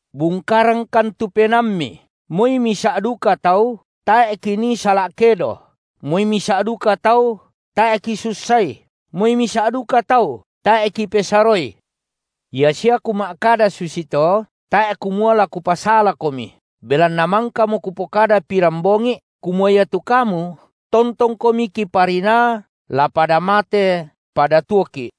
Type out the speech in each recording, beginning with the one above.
Bungkarangkan tu penaammi. Moi misa’ duka tau tae’ kinii sala’ kedo, moi misa’ duka tau tae’ kisussai, moi misa’ duka tau tae’ kipesaroi. Ia sia kuma’kada susito, tae’ kumua la kupasalakomi, belanna mangkamo kupokada pirambongi’ kumua iatu kamu tontongkomi kiparinaa la pada mate pada tuoki’.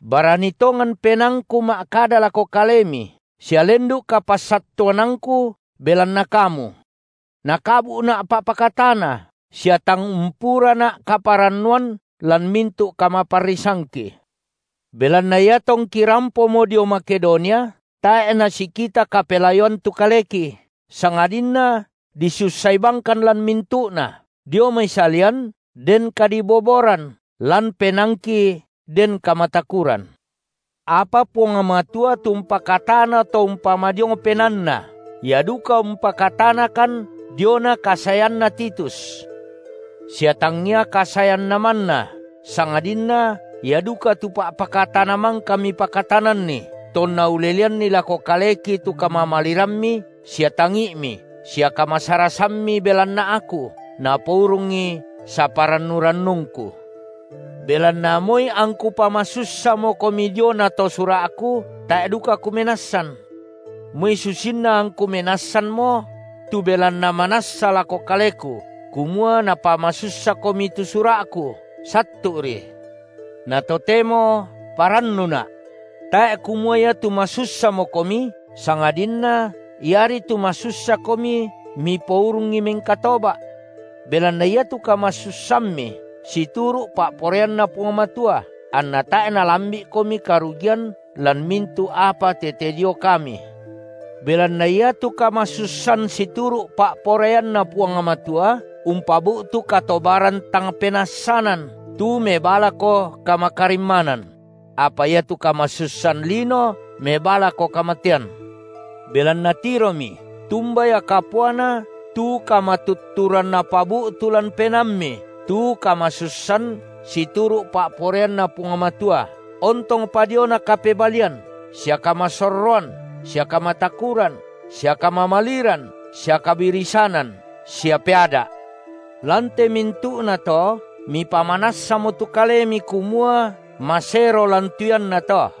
Barani tongan penaangku ma’kada lako kalemi sia lendu’ kapassattuanangku belanna kamu. Nakabu’na’ pa’pakatana sia tang umpurana’ kaparannuan lan mintu’ kamaparrisangki. Belanna iatongki rampomo dio Makedonia, tae’ nasikita kapelayoan tu kaleki, sangadinna disussai bangkan lan mintu’na, dio mai salian den kadiboboran, lan penaangki den kamatakuran. Apa Puang Matua tu umpakatana to umpamadiong penaanna, Ia duka umpakatanakan diona kasaeanna Titus; sia tangia kasaeanna manna, sangadinna ia duka tu pa’pakatana mangka mipakatananni, tonna uleleanni lako kaleki tu kamamalirammi sia tangi’mi sia kamasarasammi belanna aku, napourungi saparannu-rannungku. Belanna moi angku pamasussamokomi diona to sura’ku, tae’ duka kumenassan. Moi susinna angku menassanmo – tu belanna manassa lako kaleku kumua napamasussakomi tu sura’ku, sattu’ri – na totemo parannuna’. Tae’ kumua iatu masussamokomi, sangadinna iari tu masussakomi mipourungi mengkatoba’. Belanna iatu kamasussammi situru’ pa’poraianNa Puang Matua, anna tae’ nalambi’komi karugian lan mintu’ apa tete dio kami. Belanna iatu kamasussan situru’ pa’poraianNa Puang Matua umpabu’tu katobaran tang penassanan, tu mebaa lako kamakarimmanan; apa iatu kamasussan lino mebaa lako kamatean. Belanna tiromi, tumba ia kapuana tu kamatutturan napabu’tu lan penaammi tu kamasussan situru’ pa’poraianNa Puang Matua, ontongpa diona kapebalian, sia kamasorroan, sia kamatakuran, sia kamamaliran sia kabirisanan, sia peada’. Lan te mintu’nato mipamanassamo tu kalemi kumua masero lan tu iannato.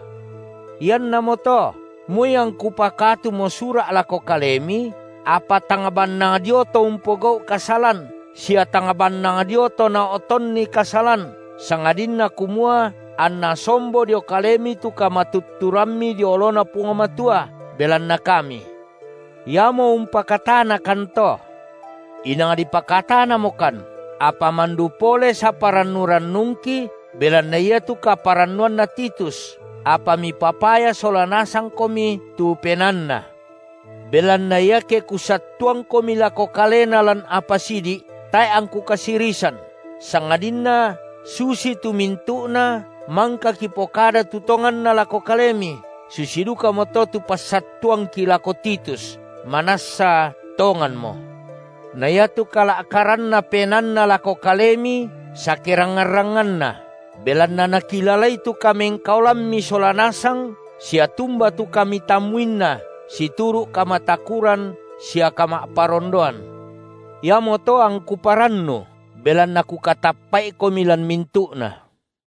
Iannamoto moi angku pakatumo sura’ lako kalemi, apa tang bannang dio to umpogau’ kasalan sia tang bannang dio to nao’tonni kasalan, sangadinna kumua anna sombo dio kalemi tu kamatutturammi dio oloNa Puang Matua belanna kami. Iamo umpakatanakanto. Inang dipakatanamokan, apa mandu pole saparannu-rannungki belanna iatu kaparannuanna Titus, apa mipapaya sola nasangkomi tu penaanna. Belanna iake kusattuangkomi lako kalena lan apa sidi’, tae’ angku kasirisan, sangadinna susitu mintu’na mangka kipokada tu tonganna lako kalemi, susi dukamoto tu passattuangki lako Titus manassa tonganmo. Na iatu kala’karanna penaanna lako kalemi sakerangngan-rangnganna, belanna nakilalai tu kamengkaolammi sola nasang sia tumba tu kamitammuinna situru’ kamatakuran sia kama’parondoan. Iamoto angku parannu, belanna kukatappa’ikomi lan mintu’na.